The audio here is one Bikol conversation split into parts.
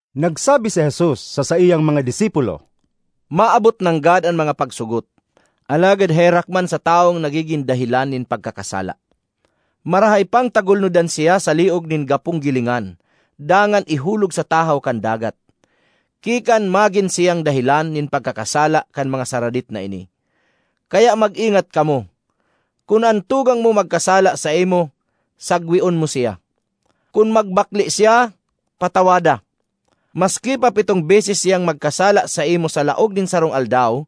Nagsabi si Jesus sa saiyang mga disipulo, “Maabot nanggad an mga pagsugot; alagad herak man sa tawong nagigin dahelan nin pagkakasala! Marahay pang tagulnodan siya sa liog nin gapong gilingan dangan ihulog sa tahaw kan dagat, ki kan magin siyang dahelan nin pagkakasala kan mga saradit na ini. Kaya mag-ingat kamo! “Kun an tugang mo magkasala saimo, sagweon mo siya; kun magbakle siya, patawada. Maski pa pitong beses siyang magkasala saimo sa laog nin sarong aldaw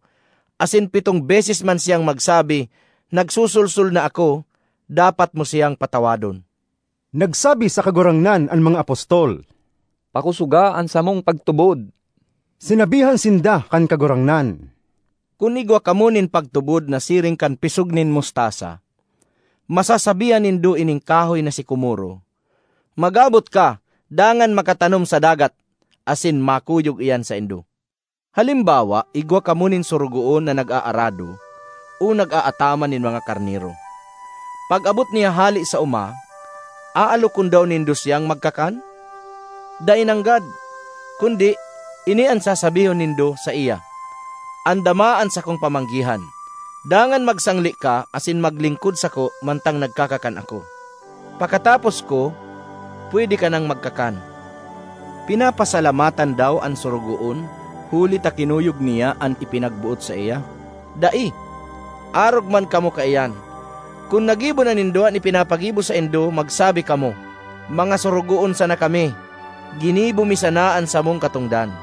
asin pitong beses man siyang magsabi, ‘Nagsosolsol na ako,’ dapat mo siyang patawadon.” Nagsabi sa Kagurangnan an mga apostol, “Pakosoga an samong pagtubod!” Sinabihan sinda kan Kagurangnan, “Kun igwa kamo nin pagtubod na siring kan pisog nin mustasa, masasabihan nindo ining kahoy na sikomoro, ‘Magabot ka dangan makatanom sa dagat!’ asin makuyog iyan saindo. ”Halimbawa igwa kamo nin sorogoon na nag-aarado o nagaataman nin mga karnero. Pag-abot niya hale sa oma, aalokon daw nindo siyang magkakan? Dai nanggad! Kundi, ini an sasabihon nindo saiya, ‘Andama an sakong pamanggihan, dangan magsangle ka asin maglingkod sako mantang nagkakakan ako. Pakatapos ko, pwede ka nang magkakan.’ Pinapasalamatan daw an sorogoon huli ta kinuyog niya an ipinagboot saiya? Dai! Arog man kamo kaiyan; kun nagibo na nindo an ipinapagibo saindo magsabi kamo, ‘Mga sorogoon sana kami; ginibo mi sana an samong katongdan!’”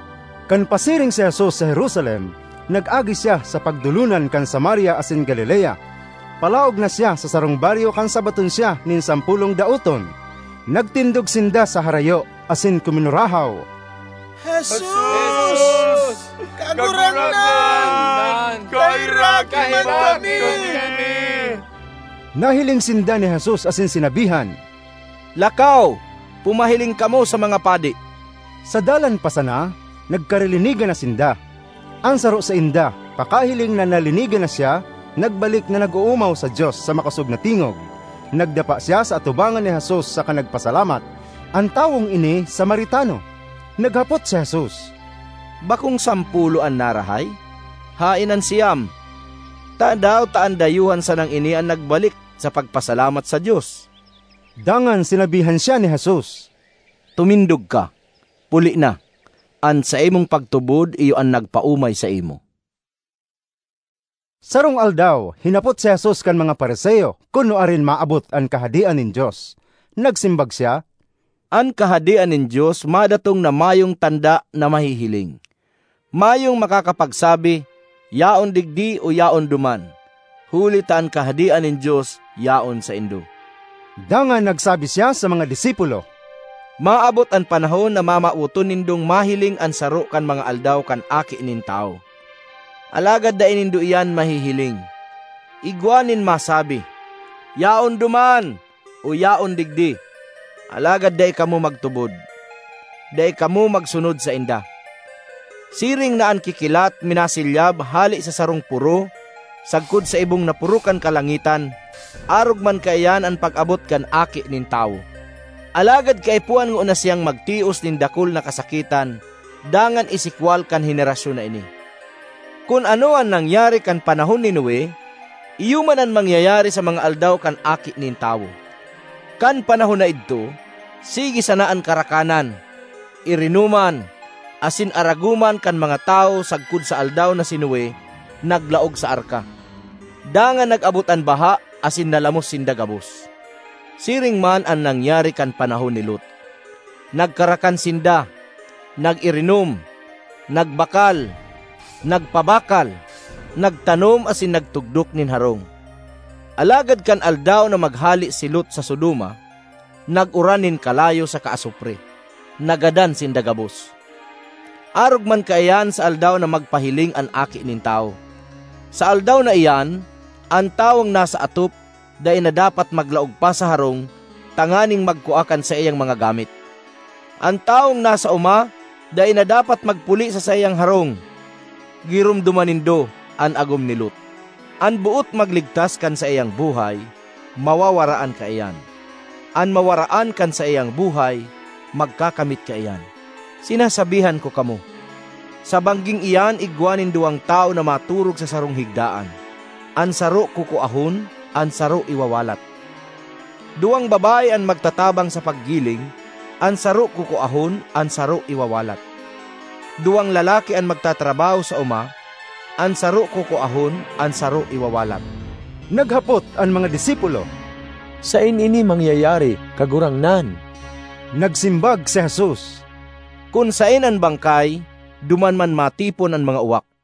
Kan pasiring si Jesus sa Jerusalem, nag-agi siya sa pagdolonan kan Samaria asin Galilea. Palaog na siya sa sarong baryo kan sabaton siya nin sampolong daoton. Nagtindog sinda sa harayo, asin kuminurahaw, “Jesus, Kagurangnan! Kaheraki man kami!” Nahiling sinda ni Jesus asin sinabihan, “Lakaw, pumahiling kamo sa mga padi.” Sa dalan pa sana, nagkarilinigan na sinda. An saro sainda, pakahiling na nalinigan na siya, nagbalik na nag-oomaw sa Dios sa makosog na tingog. Nagdapa siya sa atubangan ni Jesus saka nagpasalamat. An tawong ini Samaritano. Naghapot si Jesus, “Bakong sampolo an narahay? Haen an siyam? Tadaw ta an dayuhan sanang ini an nagbalik sa pagpasalamat sa Dios?” Dangan sinabihan siya ni Jesus, “Tumindog ka! Puli na; an saimong pagtubod iyo an nagpaomay saimo.” Sarong aldaw hinapot si Jesus kan mga Fariseo kun nuarin maabot an Kahadean nin Dios. Nagsimbag siya, “An Kahadean nin Dios madatong na mayong tanda na mahihiling. Mayong makakapagsabi, ‘Yaon digdi!’ o ‘Yaon duman!’ huli ta an Kahadean nin Dios yaon saindo.” Dangan nagsabi siya sa mga disipulo, “Maabot an panahon na mamawoton nindong mahiling an saro kan mga aldaw kan Aki nin Tawo, alagad dai nindo iyan mahihiling. Igwa nin masabi, ‘Yaon duman!’ o ‘Yaon digdi!’ Alagad dai kamo magtubod, dai kamo magsunod sainda. Siring na an kikilat minasilyab hale sa sarong poro sagkod sa ibong na poro kan kalangitan, arog man kaiyan an pag-abot kan Aki nin Tawo. Alagad kaipuhan ngona siyang magtios nin dakul na kasakitan dangan isikwal kan henerasyon na ini. Kun ano an nangyari kan panahon ni Noe iyo man an mangyayari sa mga aldaw kan Aki nin Tawo. Kan panahon na idto, sige sana an karakanan, irinoman, asin aragoman kan mga tawo sagkod sa aldaw na si Noe naglaog sa arka. Dangan nag-abot an baha asin nalamos sinda gabos. Siring man an nangyari kan panahon ni Lot. Nagkarakan sinda, nag-irinom, nagbakal, nagpabakal, nagtanom asin nagtugdok nin harong. Alagad kan aldaw na maghale si Lot sa Sodoma, nag-uran nin kalayo saka asupre; nagadan sinda gabos. Arog man kaiyan sa aldaw na magpahiling an Aki nin Tawo. ”Sa aldaw na iyan, an tawong nasa atop, dai na dapat maglaog pa sa harong tanganing magkua kan saiyang mga gamit; an tawong nasa oma dai na dapat magpuli sa saiyang harong. Giromdoma nindo an agom ni Lot! An boot magligtas kan saiyang buhay, mawawaraan kaiyan; an mawaraan kan saiyang buhay, magkakamit kaiyan. Sinasabihan ko kamo, sa bangging iyan igwa nin duwang tawo na maturog sa sarong higdaan; an saro kukuahon, an saro iwawalat. Duwang babae an magtatabang sa paggiling; an saro kukuahon, an saro iwawalat. (Duwang lalaki an magtatrabaho sa oma; an saro kukuahon, an saro iwawalat.)” Naghapot an mga disipulo, “Saen ini mangyayari, Kagurangnan?” Nagsimbag si Jesus, “Kun saen an bangkay, duman man matipon an mga uwak.”